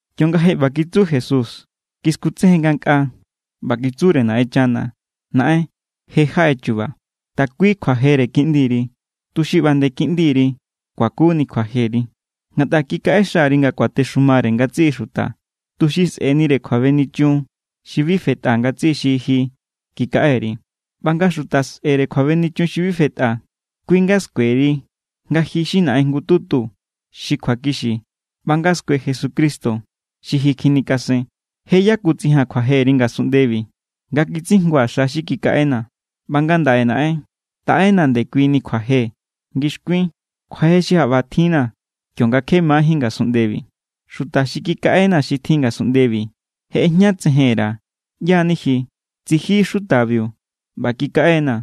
Kionga je ꞌba kitsu Jesús, kiskutsejen ngankꞌaa ꞌba kitsure Naꞌenchana: —Naꞌen, je= jaꞌe chu̱ba̱. Takui kjuajere Kiꞌndiri, tuxi ꞌba nde Kiꞌndiri kuakuni kjuajeri. Ngatꞌa kikaꞌexa_ri nga kuatexumare ngatsiꞌi xuta, tuxi sꞌe̱nire kjuabenichun xi bi fetꞌa ngatsiꞌi xi ji kikaꞌe_ri. ꞌBa nga xuta sꞌe̱re kjuabenichun xi bi fetꞌa, kui= nga skueri nga ji= xi Naꞌen jngututu xi kjuakixi ꞌba nga skue Jesucristo xi ji kjinikasen. ’Je= yakutsijaa̱n kjuajeri ngasunꞌndebi nga kitsijngua̱ xa xi kikaꞌena̱. ꞌBa ngandaꞌe Naꞌen, taꞌenaa̱ ndekuini kjuaje ngixkuin, kjuaje xi jaꞌba tjinna̱ kionga kje majín ngasunꞌndebi. ’Xuta xi kikaꞌenaa̱ xi tjin ngasunꞌndebi je ꞌejñatsejen_ra̱ ꞌyá= ni ji. Tsiji xutabiu ꞌba kikaꞌe=naa̱,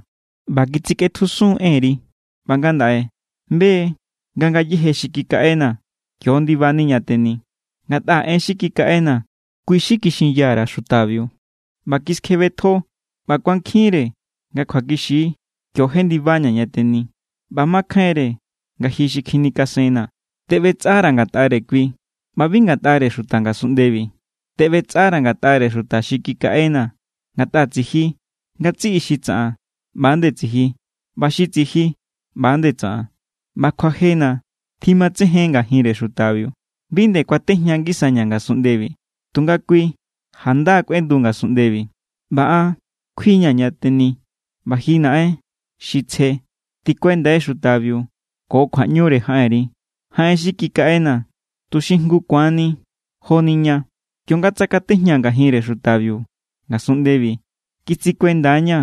ꞌba kitsikꞌetjusun= enri. ꞌBa ngandaꞌe be= nga ngayéje xi kikaꞌenaa̱ kio= ndibani ña teni. Ngatꞌa en xi kikaꞌenaa̱, kui= xi kixinya_ra̱ xutabiu, ꞌba kiskjebetjo ꞌba kuankjinre nga kjuakixi kio jendibaña̱ ña teni. ꞌBa makjainre nga ji kjinikasennaa̱. ’Teꞌbetsꞌara̱ ngatꞌare kui ꞌba bi ngatꞌare xuta ngasunꞌndebi. Teꞌbetsꞌara̱ ngatꞌare xuta xi kikaꞌenaa̱, ngatꞌa tsiji. Ngatsiꞌi xi tsaꞌan, ꞌba=nde tsiji. ꞌBa xi tsiji, ꞌba=nde tsaꞌan. ꞌBa kjuajena̱ tjimatsejen ngajinre xutabiu. ’Bi nde kuatejña ngisaña̱ ngasunꞌndebi, tunga kui janda= kꞌuendu ngasunꞌndebi, ꞌba an kjuia̱ ña teni. ꞌBa ji Naꞌen xi tsje, tikuendai xutabiu ko kjuaꞌñure jaꞌenri, jaꞌen xi kikaꞌenaa̱, tuxi jngu ku̱anni joni ña. Kionga tsakatejñaa̱ ngajinre xutabiu ngasunꞌndebi, kitsikuenda=ña̱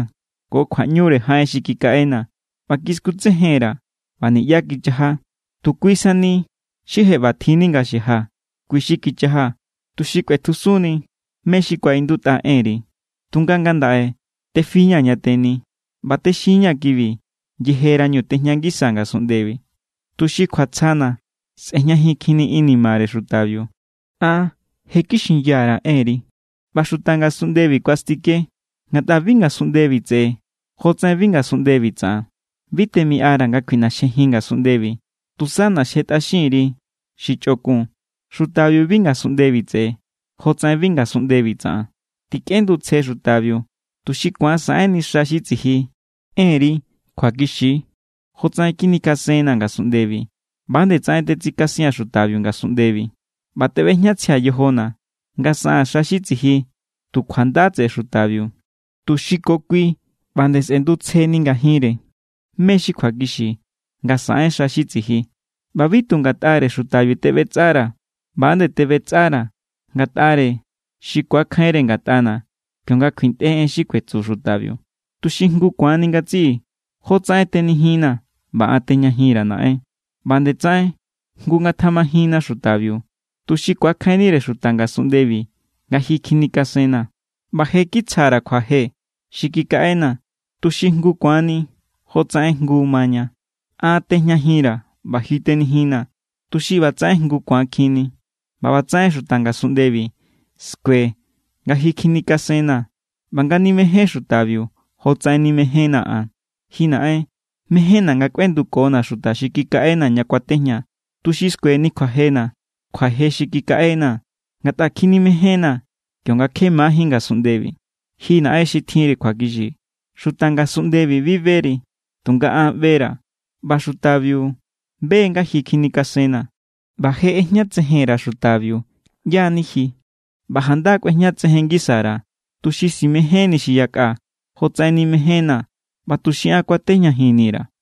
ko kjuaꞌñure jaꞌen xi kikaꞌenaa̱ ꞌba kiskutsejen_ra̱, ꞌba niꞌyá kichaja. Tu kui sani xi je ꞌbatjinni nga xaja, kui= xi kichaja, tuxi kꞌuetjusunni mé= xi kuaꞌindutꞌa enri. ’Tunga ngandaꞌe tefi=ña̱ ña teni. ꞌBa texin=ña̱ kibi yejerañu tejña ngisaa̱ ngasunꞌndebi, tuxi kjuatsjana̱ sꞌe̱jñajinkjinni inimare xutabiu. An je= kixinya_ra̱ enri, ꞌba xuta ngasunꞌndebi kuastike=, ngatꞌa bi ngasunꞌndebi tseꞌe jotsaꞌen bi ngasunꞌndebi tsaꞌan. Bi temiꞌara̱ nga kjuiꞌnaxjejin ngasunꞌndebi, tusa ꞌnaxjetꞌaxin_ri xi chꞌokun. Xutabiu bi ngasunꞌndebi tseꞌe, jotsaꞌen bi ngasunꞌndebi tsaꞌan. Tikꞌendutsje xutabiu, tuxi ku̱an saꞌenni xa xi tsiji. Enri kjuakixi=. Jotsaꞌen kjinikasennaa̱ ngasunꞌndebi, ꞌba=nde tsaꞌen tetsikasia̱n xutabiu ngasunꞌndebi. ꞌBa teꞌbejñatsjia̱ yojona̱ nga saꞌaa̱n xa xi tsiji tu kjuanda tseꞌe xutabiu, tuxi ko kui ꞌba nde sꞌendutsjeni ngajinre mé= xi kjuakixi nga saꞌen xa xi tsiji. ’ꞌBa bi tu ngatꞌare xutabiu teꞌbetsꞌara̱. ꞌBa=nde teꞌbetsꞌara̱ ngatꞌare xi ku̱akjainre ngatꞌana̱ kionga kjuintꞌe en xi kuetsu xutabiu, tuxi jngu ku̱ani ngatsiꞌi. Jotsaꞌen tenijinnaa̱ ꞌba an tejñajinra̱, Naꞌen, ꞌba nde tsaꞌen jngu ngatjamajinna xutabiu, tuxi ku̱akjainnire xuta ngasunꞌndebi nga ji kjinikasennaa̱. ꞌBa je= kitsja_ra̱ kjuaje xi kikaꞌenaa̱, tuxi jngu ku̱ani jotsaꞌen jngu maña. An tejñajin_ra̱ ꞌba ji tenijinnaa̱, tuxi ꞌba tsaꞌen jngu ku̱ankjinni, ꞌba ꞌbatsaꞌen xuta ngasunꞌndebi skue nga ji kjinikasennaa̱ ꞌba nga nimején xutabiu jotsaꞌen nimejénnaa̱ an. ’Ji Naꞌen, mejénna̱ nga kꞌuendukona̱ xuta xi kikaꞌenaa̱ ña kuatejñaa̱, tuxi skueni kjuajena̱, kjuaje xi kikaꞌenaa̱, ngatꞌa kjinimején=naa̱ kionga kje majín ngasunꞌndebi. Ji Naꞌen xi tjinri kjuakixi, xuta ngasunꞌndebi bi beri. Tunga an ꞌbera̱, ꞌba xutabiu be= nga ji kjinikasennaa̱. ꞌBa je ꞌejñatsejen_ra̱ xutabiu ꞌyá= ni ji ꞌba janda= kꞌuejñatsejen ngisa_ra̱, tuxi simejénni xi yakꞌa jotsaꞌen nimejénnaa̱ ꞌba tuxi an kuatejñajinni_ra̱.